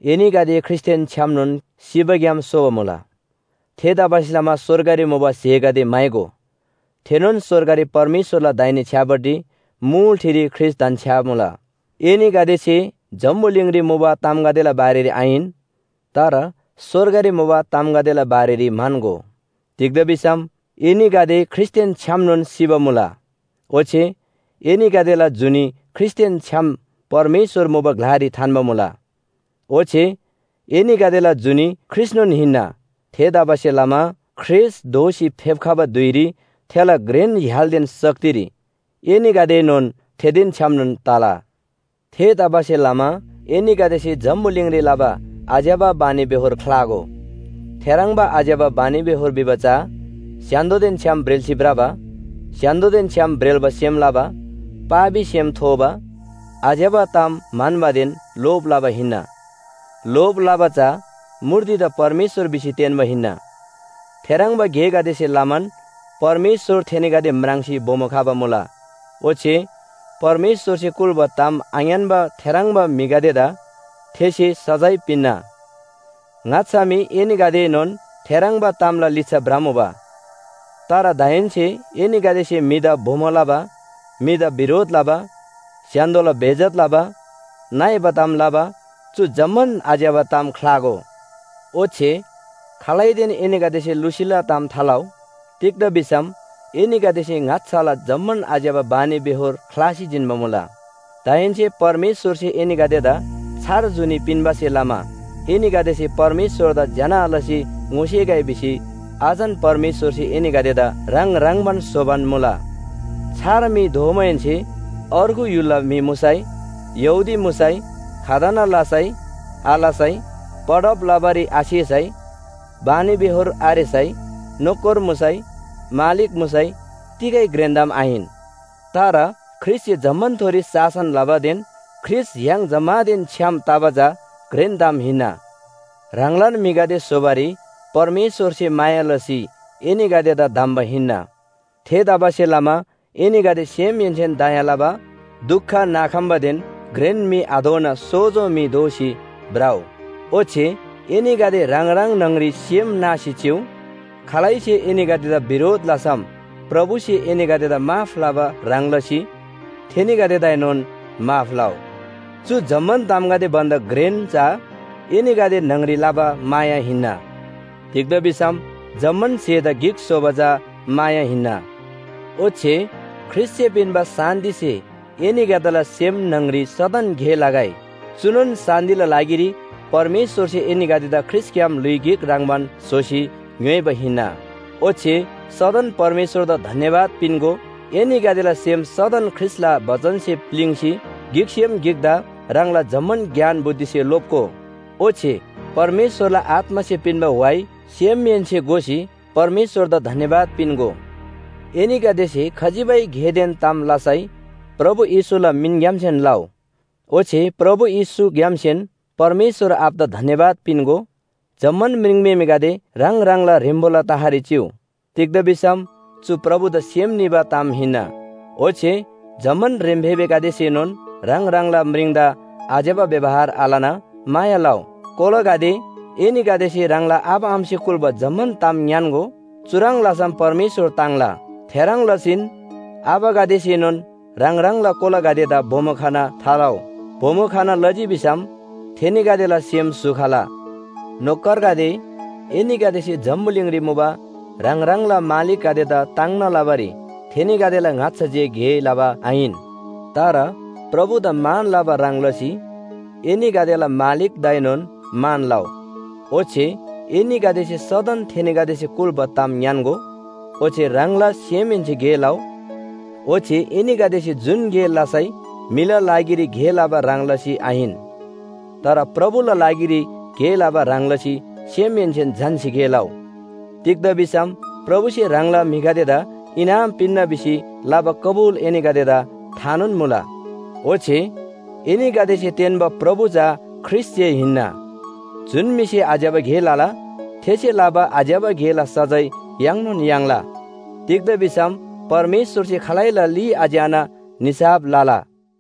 एनीगदे ख्रीष्‍टदेन छ्‌यामनोन सिबाग्‍याम सोबा मुला। थेतबासेलमा स्‍वर्गरी मुबा स्‍हेगदे म्‍हाइगो। थेनोन स्‍वर्गरी परमेश्‍वरला दाहिने छ्‌यापट्टि मुल ठिरी ख्रीष्‍ट धन्‍छ्‌यामुला। एनीगदेसे जम्‍बुलिङरी मुबा तामगदेला बारेरी आहिन तर स्‍वर्गरी मुबा तामगदेला बारेरी म्‍हन्‍गो। तिग्‍दा भिसम एनीगदे ख्रीष्‍टदेन छ्‌यामनोन सिबा मुला। ओच्‍छे एनीगदेला जुनी ख्रीष्‍टदेन छ्‌याम परमेश्‍वर मुबा ग्‍लारी थान्‍बा मुला। ओच्‍छे एनीगदेला जुनी ख्रीष्‍टनोन हिन्‍ना। थेतबासेलमा ख्रीष्‍ट दोःसी फेप्‍खबा धुइरी थेला घ्रेन य्‍हालदेन शक्तिरी एनीगदेएनोन थेदेन छ्‌यामनोन तला। थेतबासेलमा एनीगदेसे जम्‍बुलिङरी लबा आज्‍यबा बानीबेहोर ख्‍लागो। थेह्रङ्बा आज्‍यबा बानीबेहोर भिबा चा स्‍य्‍हान्‍दोदेन छ्‌याम ब्रेल्‍सी भ्रबा, स्‍य्‍हान्‍दोदेन छ्‌याम ब्रेल्‍बा सेम लबा, पापी सेम थोबा, आज्‍यबा ताम म्‍हन्‍बादेन लोभ लबा हिन्‍ना। लोभ लबा चा मूर्तिदा परमेश्‍वर भिसी तेन्‍बा हिन्‍ना। थेह्रङ्बा गेगदेसे लमान परमेश्‍वर थेनीगदे म्राङ्सी बोमो खबा मुला ओच्‍छे परमेश्‍वरसे कुल्‍बा ताम आङ्‌यान्‍बा थेह्रङ्बा म्‍हिगदेदा थेसे सजाय पिन्‍ना। ङाच्‍छा मी एनीगदेएनोन थेह्रङ्बा तामला लिच्‍छा भ्रमुबा। तर दाहेन्‍से एनीगदेसे म्‍हिदा बोमो लबा, म्‍हिदा बिरोध लबा, स्‍य्‍हान्‍दोला बेइज्‍जत लबा, नइबा ताम लबा चु जम्‍मान आज्‍यबा ताम ख्‍लागो। ओच्‍छे खालैदेन एनीगदेसे लुसीला ताम थालउ। तिग्‍दा भिसम एनीगदेसे ङाच्‍छाला जम्‍मान आज्‍यबा बानीबेहोर ख्‍लासी जिन्‍बा मुला। दाहेन्‍से परमेश्‍वरसे एनीगदेदा छार जुनी पिन्‍बासे लमा एनीगदेसे परमेश्‍वरदा ज्‍यना लसी ङोसेगै भिसी अझन परमेश्‍वरसे एनीगदेदा ह्राङ ह्रङ्‌बान स्‍होबान मुला। छार म्‍हि दोमाहेन्‍से अर्गु य्‍हुलला म्‍हि मुसै, यहूदी मुसै, खतना लसै आलसै, पढब लबारी आसेसै, बानीबेहोर आरेसै नोकर मुसै मालिक मुसै तिगै घ्रेन ताम आहिन। तर ख्रीष्‍टसे जम्‍मानथोरी शासन लबादेन ख्रीष्‍ट य्‍हाङ जम्‍मानदेन छ्‌याम तबा चा घ्रेन ताम हिन्‍ना। ह्राङलान म्‍हिगदे स्‍होबारी परमेश्‍वरसे माया लसी एनीगदेदा धम्‍बा हिन्‍ना। थेतबासेलमा एनीगदे सेमहेन्‍सेन दया लबा, दुख नाखम्‍बादेन घ्रेन म्‍हि आदोना सोजो म्‍हि दोसी भ्रउ। ओच्‍छे एनीगदे ह्राङ ह्राङ न्‍हङरी सेम नासी चिउ। खालैसे एनीगदेदा बिरोध लसम प्रभुसे एनीगदेदा माफ लबा ह्रङ् लसी थेनीगदेदाएनोन माफ लउ। चु जम्‍मान तामगदे भन्‍दा घ्रेन चा एनीगदे न्‍हङरी लबा माया हिन्‍ना। तिग्‍दा भिसम जम्‍मान स्‍हेदा गिक स्‍होबा चा माया हिन्‍ना। ओच्‍छे ख्रीष्‍टसे पिन्‍बा शान्‍तिसे एनीगदेला सेम न्‍हङरी सदन गे लगै। चुनोन शान्‍तिला लागिरी परमेश्‍वरसे एनीगदेदा ख्रीष्‍टग्‍याम ल्‍हुइ गिक ह्रङ्‌बान स्‍होसी ङ्‌योइबा हिन्‍ना। ओच्‍छे सदन परमेश्‍वरदा धन्‍यवाद पिन्‍गो। एनीगदेला सेम सदन ख्रीष्‍टला बचनसे प्‍लिङ्‌सी गिकसेम गिकदा ह्राङला जम्‍मान ज्ञान बुद्धिसे लोप्‍गो। ओच्‍छे परमेश्‍वरला आत्‍मासे पिन्‍बा व्‍हाइ सेमहेन्‍से गोसी परमेश्‍वरदा धन्‍यवाद पिन्‍गो। एनीगदेसे खजिबै गेदेन ताम लसै प्रभु येशूला मिनग्‍यामसेन लउ। ओच्‍छे प्रभु येशूग्‍यामसेन परमेश्‍वर आबादा धन्‍यवाद पिन्‍गो। जम्‍मान म्रिङम्‍हेमेगदे ह्राङ ह्राङला ह्रेम्‍बोला तहरी चिउ। तिग्‍दा भिसम चु प्रभुदा सेम निबा ताम हिन्‍ना। ओच्‍छे जम्‍मान ह्रेम्‍फेबेगदेसेनोन ह्राङ ह्राङला म्रिङदा आज्‍यबा व्‍यवहार आलना माया लउ। कोलागदे, एनीगदेसे ह्राङला आबा आमासे कुल्‍बा जम्‍मान ताम ङ्‌यान्‍गो। चुह्रङ् लसम परमेश्‍वर ताङ्ला। थेह्रङ् लसीन आबागदेसेनोन ह्राङ ह्राङला कोलागदेदा बोमो खना थालउ। बोमो खना लजी भिसम थेनीगदेला सेम स्‍हु खला। नोकरगदे, एनीगदेसे जम्‍बुलिङरी मुबा ह्राङ ह्राङला मालिकगदेदा ताङ्ना लबारी थेनीगदेला ङाच्‍छा जे गे लबा आहिन। तर प्रभुदा मान लबा ह्रङ् लसी एनीगदेला मालिकदाएनोन मान लउ। ओच्‍छे एनीगदेसे सदन थेनीगदेसे कुल्‍बा ताम ङ्‌यान्‍गो। ओच्‍छे ह्राङला सेमहेन्‍से गे लउ। ओच्‍छे एनीगदेसे जुन गे लसै म्‍हिला लागिरी गे लबा ह्रङ् लसी आहिन, तर प्रभुला लागिरी गे लबा ह्रङ् लसी सेमहेन्‍सेन झन्‍सी गे लउ। तिग्‍दा भिसम प्रभुसे ह्राङला म्‍हिगदेदा इनाम पिन्‍ना भिसी लबा कबुल एनीगदेदा थानोन मुला। ओच्‍छे एनीगदेसे तेन्‍बा प्रभु चा ख्रीष्‍ट जे हिन्‍ना। जुन म्‍हिसे आज्‍यबा गे लला थेसे लबा आज्‍यबा गेला सजाय याङ्नोन याङ्ला। तिग्‍दा भिसम परमेश्‍वरसे खालैला ली आच्‍याना निसाफ लला।